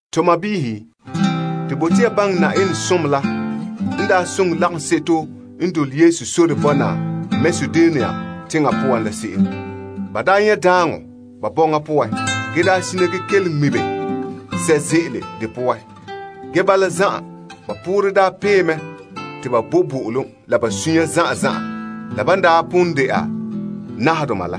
To sɔɔnrɔ, to bote ya baŋɛ Na'ayenɛ som la n daa soŋɛ lagaŋseto n dole Yesu sore bɔna Makedonia teŋa poan la se'em. Ba daa nyɛ daaŋɔ ba bɔŋa poan ge daa sina ge kelom ŋmibe sɛ' ze'ele de poan. Ge bala zan'an, ba poorɛ daa pee mɛ te ba bo bo'olom la ba sunya zan'an zan'an la ban daa pon ba' dɛna nahadoma wa.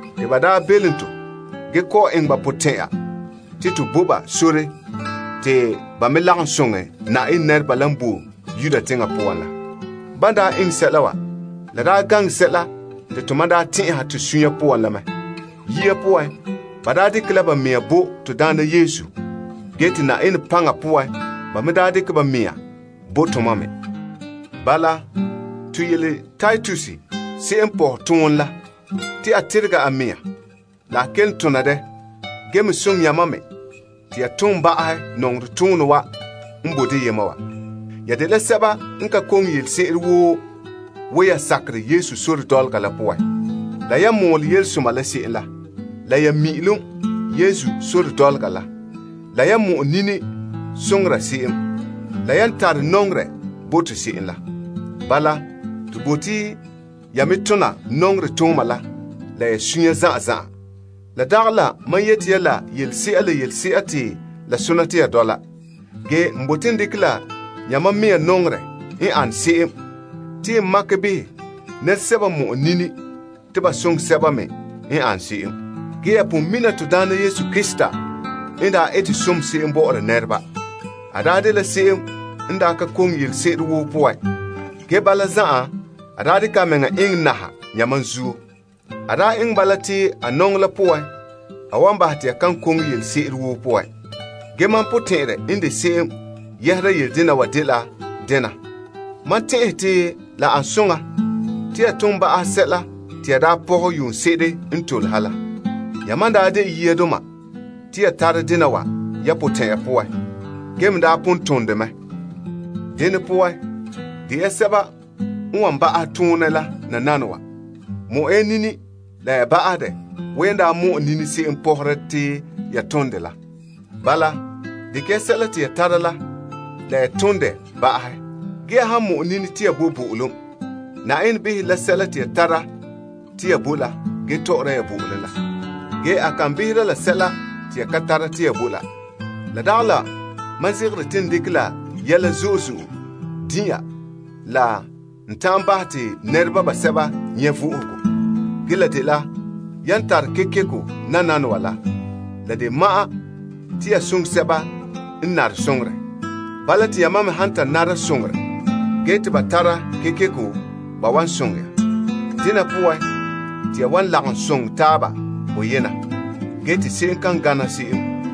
Te ba daa belom to ge kɔ'ɔn eŋɛ ba potɛn'ɛra te to bo ba sore te ba me lagom soŋɛ Na'ayenɛ nɛreba la n boe Yuda teŋa poan la. Ban daa eŋɛ sɛla wa, la daa gaŋɛ sɛla te to mam daa tɛn'ɛha to sunya poan la mɛ. Yia poan, ba daa dekɛ la ba mɛhe bo to Daana Yesu ge te Na'ayenɛ paŋa poan ba me daa dekɛ ba mɛhe bo tomam me. Bala, to yele Titus se'em n pohɛ toonɛ la te a teregɛ a mea la a kelom tona dɛ ge me soŋɛ yamam me te ya tom ba'ahɛ nɔŋerɛ toonɛ wa n boe deyema wa. Ya dela sɛba n ka koŋe yelese'ere woo wo ya sakerɛ Yesu sore dɔlɔga poan la, la yan mɔɔlɛ Yelesoma la se'em la, la ya mi'ilom Yesu sore dɔlɔga la, la yan mɔ'ɛ nini soŋora se'em, la yan tare nɔŋerɛ bo to se'em la. Bala, to bote ya me tona nɔŋerɛ tooma la la ya sunya zan'an zan'an. La dagɛ la mam yete ya la yelese'a la yelese'a te la sona te ya dɔla. Ge n bote n dekɛ la yamam mɛhe nɔŋerɛ n ane se'em te n makɛ behɛ nɛresɛba n mɔ'ɛ nini te ba soŋɛ sɛba me n ane se'em. Ge ya pon mina to Daana Yesu Krista n daa ete som se'em bɔ'ɔra nɛreba. A daa dela se'em n daa ka koŋe yelese'ere woo poan. Ge bala zan'an, a daa eŋɛ a mɛŋa naha yamam zuo. A daa eŋɛ bala te a nɔŋɔ la poan, a wan bahɛ te ya kan koŋe yelese'ere woo poan. Ge mam potɛn'ɛrɛ n de se'em yɛhera yele dena wa dela dena: mam tɛn'ɛhe te la ane soŋa te ya tom ba'ahɛ sɛla te ya daa pɔhɛ yuunse'ere n tole ha la. Yamam n daa de yiadoma te ya tara dena wa ya potɛn'ya poan, ge me daa pon tom mɛ. Dene poan, de ya sɛba n wan ba'ahɛ toonɛ la nananawa. Mɔ'ɛ ya nini la ya ba'ahɛ dɛ wo yan daa mɔ'ɛ nini se'em pɔ'ɔhara te ya tom dɛ la. Bala, dekɛ ya sɛla woo te ya tara la la ya tom dɛ ba'ahɛ. Ge ya han mɔ'ɛ nini te ya bo bo'olom, Na'ayenɛ behera la sɛla te ya tara te ya bo la ge tɔ'ɔra ya bo'olom la. Ge a kan behera la sɛla te ya ka tara te ya bo la. La dagɛ la mam zegere te n dekɛ la yɛla zo'e zo'e din' ya la n ta'an bahɛ te nɛreba basɛba nyɛ' vo'ohogo. Ge la dela yan tara kekeko nananawa la, la de ma'an te ya soŋɛ sɛba n nare soŋorɛ. Bala te yamam me han ta nara soŋorɛ ge te ba tara kekeko, ba wan soŋɛ ya. Dena poan, te ya wan lagom soŋɛ taaba boyena ge te se'em kan gana se'em,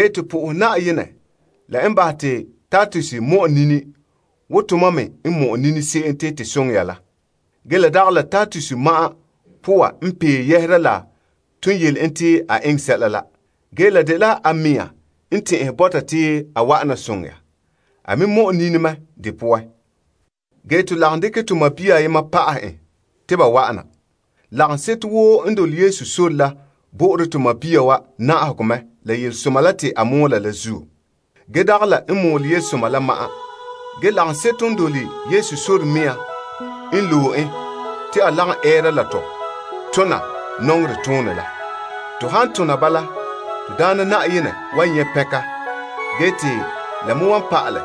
To pɛngɛ Na'ayenɛ la n bahɛ te Titus mɔ'ɛ nini wo tomam me n mɔ'ɛ nini se'em te to soŋɛ ya la. La dagɛ la Titus ma'an poorɛ n pee yɛhera la ton yele en te a eŋɛ sɛla la. Ge la dela a mɛŋa n tɛn'ɛhɛ bɔta te a wa'an na soŋɛ ya. A me mɔ'ɛ nini mɛ de poan. Ge to lagom dekɛ to sɔɔn ayema pa'ahe en te ba wa'an na. Lagaŋseto woo n dole Yesu sore la bo'ore sɔɔn wa na'ahegɔ mɛ la Yelesoma la te a mɔɔla la zuo. Le yɛ'ɛha, lagaŋseto n dole Yesu sore mea la n loe en te a lagom ɛɛra la tɔ tona nɔŋerɛ toonɛ la. To han tona bala, to Daana Na'ayenɛ wan nyɛ pɛnka ge te la me wan pa'alɛ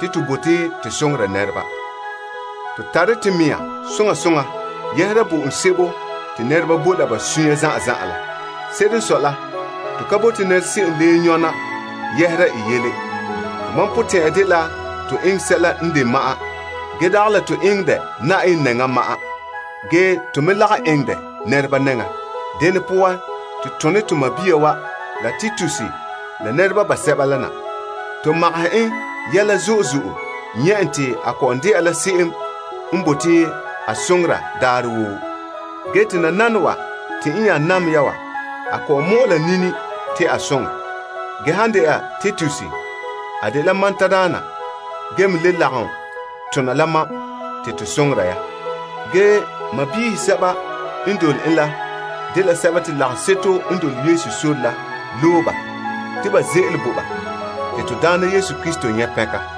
te to bote to soŋora nɛreba. To tare to mea soŋa soŋa yɛhera bo'olom sebo te nɛreba bo la ba sunya zan'an zan'an la. Se'ere n sɔe la, to ka bote se'em leen nyɔna yɛhera i yele. Tomam potɛn'ya dela to eŋɛ sɛla n de ma'an, ge dagɛ la to eŋɛ dɛ Na'ayenɛ nɛŋan ma'an, ge nɛreba mɛ nɛŋan. Dene poan, to tone to sɔɔn wa la nɛreba la na. To magahɛ en yɛla zo'e zo'e nyɛ' en te a kɔ'ɔn dɛna la se'em n bote a soŋora daarɛ woo. Ge te nananawa te n nya nam ya wa, a kɔ'ɔn mɔ'ɛ la nini te a soŋɛ. La han dɛna Titus, a dela mam tadaana ge me le lagom tona la mam te to soŋɛ ya. To sɔɔnrɔ sɛba n dole en la dela sɛba te lagaŋseto n dole Yesu sore la loe ba te ba ze'ele bo ba te to Daana Krista nyɛ' pɛnka.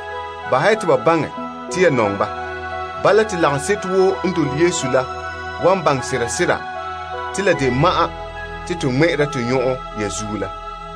Bahɛ te ba baŋɛ te ya nɔŋɛ ba. Bala te lagaŋseto woo n dole Yesu sore la wan baŋɛ sera sera te la de ma'an te to ŋmɛ'ɛre to nyɔn'ɔn ya zuo la.